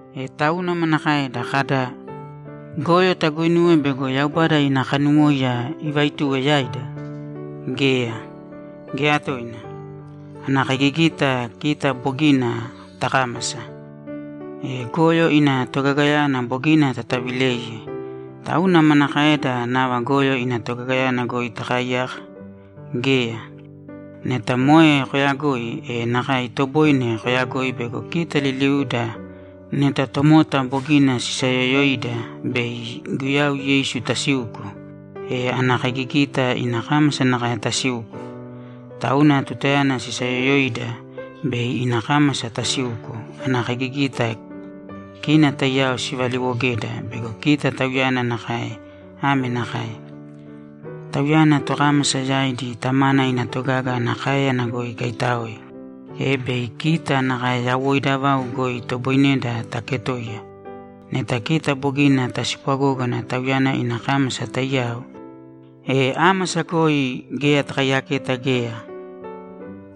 E tauna manakaeda? Kada, ‘Goyo taguuinuwe bego Yaubada ina kanuwóiya ivaaituwe yaida’? Geya, geya toina! Ana kaigigita kita bogina takámasa, e goyo ina togagayana bogina tatavileiye. Tauna manakaeda nava goyo ina togagayana goi takaaiyaka? Geya! Neta moe koyagoi, e nakae itoboine koyagoi bego kita liliuda neta tomota bogina sisayoyoida bei Guyau Yeisu tasiuko, e ana kaigigita ina kámasa nakae tasiuko. Tauna tutayana sisayoyoida, bei ina kámasa tasiuko, ana kaigigita kina taiyao sivaliwogeda bego kita Tauyana nakae ame nakae: Tauyana tokámasa yaidi Tamana ina togaga ana káeyana goi ikaitáoe, e bei kita nakae yawoida vau goi itoboineda taketoiya. Neta kita bogina taspwagógana Tauyana ina kámasa taiyao, e ámasa goi geya takaiyaketa geya,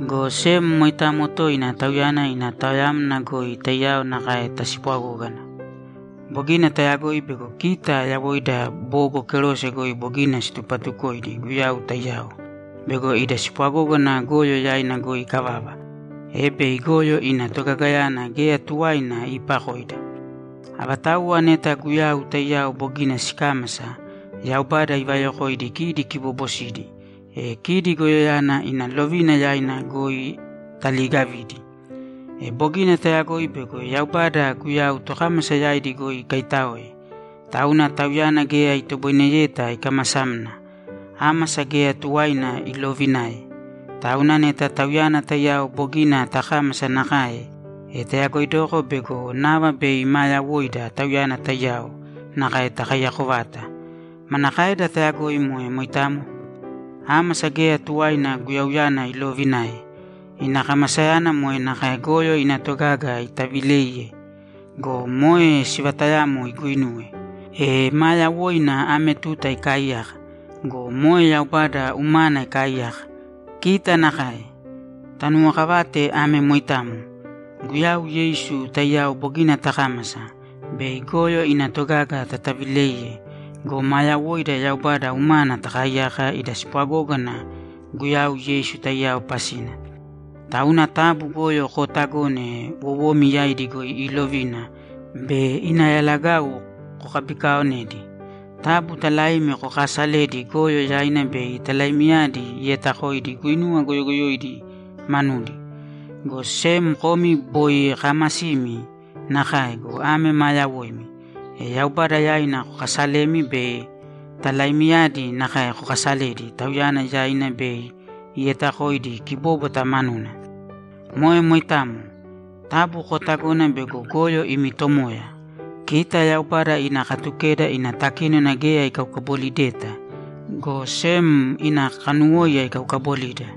go sem moitamo toina Tauyana ina taoyamna goi taiyao nakae taspwagógana. Bogina tayagoi bego kita yawoida bogo kerose goi bogina situpatukoidi Guyau taiyao bego ida spwagógana goyo yaina goi ikavava, e bei goyo ina togagayana geya tuwaina iipakoida. Avatauwa neta Guyau taiyao bogina sikámasa, Yaubada ivayokoidi kidi kiboobosidi, e kidi goyoyana ina lovina yaina goi taliigavidi. E bogina tayagoi bego Yaubada Guyau tokámasa yaidi goi ikaitáoe, tauna Tauyana geya itoboineyeta ikamasamna. Ámasa geya tuwaina iloovinae. Tauna neta Tauyana taiyao bogina takámasa nakae, e tayagoidoko bego nava bei maa yawoida Tauyana taiyao nakae takaiyako vata. Manakaeda tayagoi moe moitamo? Ámasa geya tuwaina Guyauyana iloovinae. Ina kamasayana moe nakae goyo ina togaga itavileiye go, moe sivatayamo iguinuwe. E maa yawoina ame tuta ikaaiyaka go, moe Yaubada umana ikaaiyaka. Kita nakae. Tanuwokavāte ame moitamo: Guyau Yeisu taiyao bogina takámasa, bei goyo ina togaga tatavileiye go, maa yawoida Yaubada umana takaaiyaka ida spwagógana Guyau Yeisu taiyao pasina. Tauna taabu goyo kootagōne wowomi yaidi goi iilovina bei ina yalagau kokabikaaonedi. Taabu talaimi kokaasalēdi goyo yaina bei talaimiyadi ietakoidi guinuwa goyogoyoidi manudi. Go sem komi boi kaamasimi nakae go, ame maa yawoimi, e Yaubada yaina kokaasalēmi be talaimiyadi nakae kokaasalēdi Tauyana yaina bei ietakoidi kibóbwata manuna. Moe moitamo. Taabu kootagōna bego goyo imi tomoya. Kita Yaubada ina Katukeda ina takínona geya ikaukabolideta, go sem ina kanuwóiya ikaukabolida.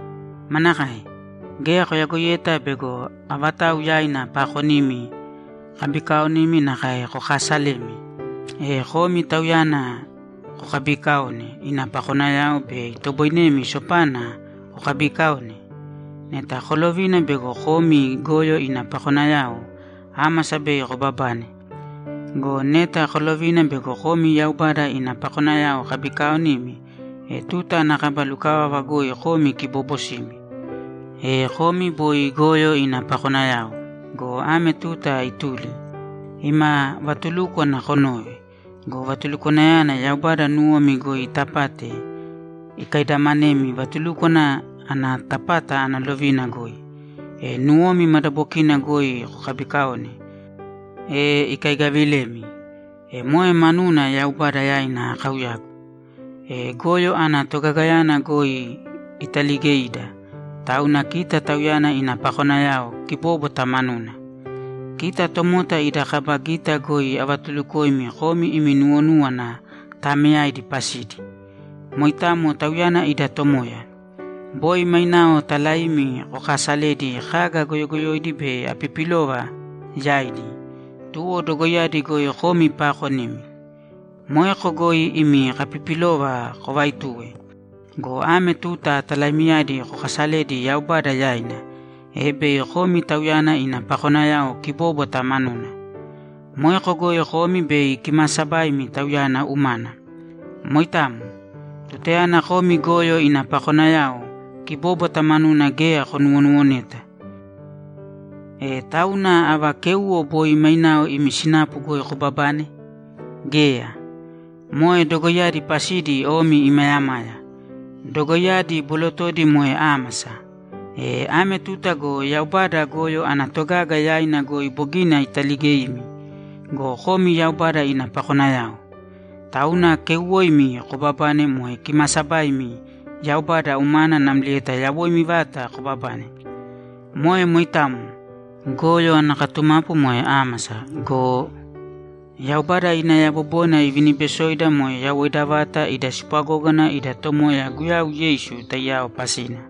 Manakae? Geya koyagoiyeta bego avatau yaina paakonimi kabikaaonimi nakae kokaasalemi, e komi tauyana kokabiikaone ina pakonayao be itoboinemi sopana kokabikaone? Neta kolovina bego komi goyo ina pakonayao, ámasa bei kobabane. Go neta kolovina bego komi Yaubada ina pakonayao kabikaaonimi, e tuta ana kaba lukavava goi komi kiboobosimi. E komi boi goyo ina pakonayao go, ame tuta ituli. Ima vatulúkwana konove go, vatulukwanayana Yaubada nuwomi goi itapate ikaidamanemi vatulúkwana ana tapata ana lovina goi, e nuwomi madabokina goi kokabikaone, e ikaigavilemi. E moe manuna Yaubada yaina akauyagu. E goyo ana togagayana goi italigeida, tauna kita Tauyana ina pakonayao kibóbwata manuna. Kita tomota ida kaba gita goi avatulukoimi komi imi nuwonúwana taameyaidi pasidi. Moitamo Tauyana ida Tomoya. Boi mainao talaimi kokaasaledi kaga goyogoyoidi be apipilova yaidi, tuwo dogoiyadi goi komi paakonimi. Moeko goi imi kapipilova kovaituwe. Go ame tuta talaimiyadi kokasalēdi Yaubada yaina, e bei komi Tauyana ina pakonayao kibóbwata manuna. Moeko goi komi bei kimaasabaimi Tauyana umana. Moitamo. Tutayana komi goyo ina pakonayao, kibóbwata manuna geya konuwonuwoneta. E tauna ava kéuwo boi mainao imi sinapu goi kobabane? Geya! Moe dogoiyadi pasidi omi imayamaya! Dogoiyadi bolotodi moe ámasa! E ame tuta go Yaubada goyo ana togaga yaina goi bogina italigeimi go, komi Yaubada ina pakonayao. Tauna keuwoimi kobabane moe kimaasabaimi Yaubada umana namlieta yawoimi vata kobabane. Moe moitamo. Goyo ana katumapu moe ámasa go, Yaubada ina yabobona iviniibesoida moe yawoida vata ida spwagógana ida Tomoya Guyau Yeisu taiyao pasina.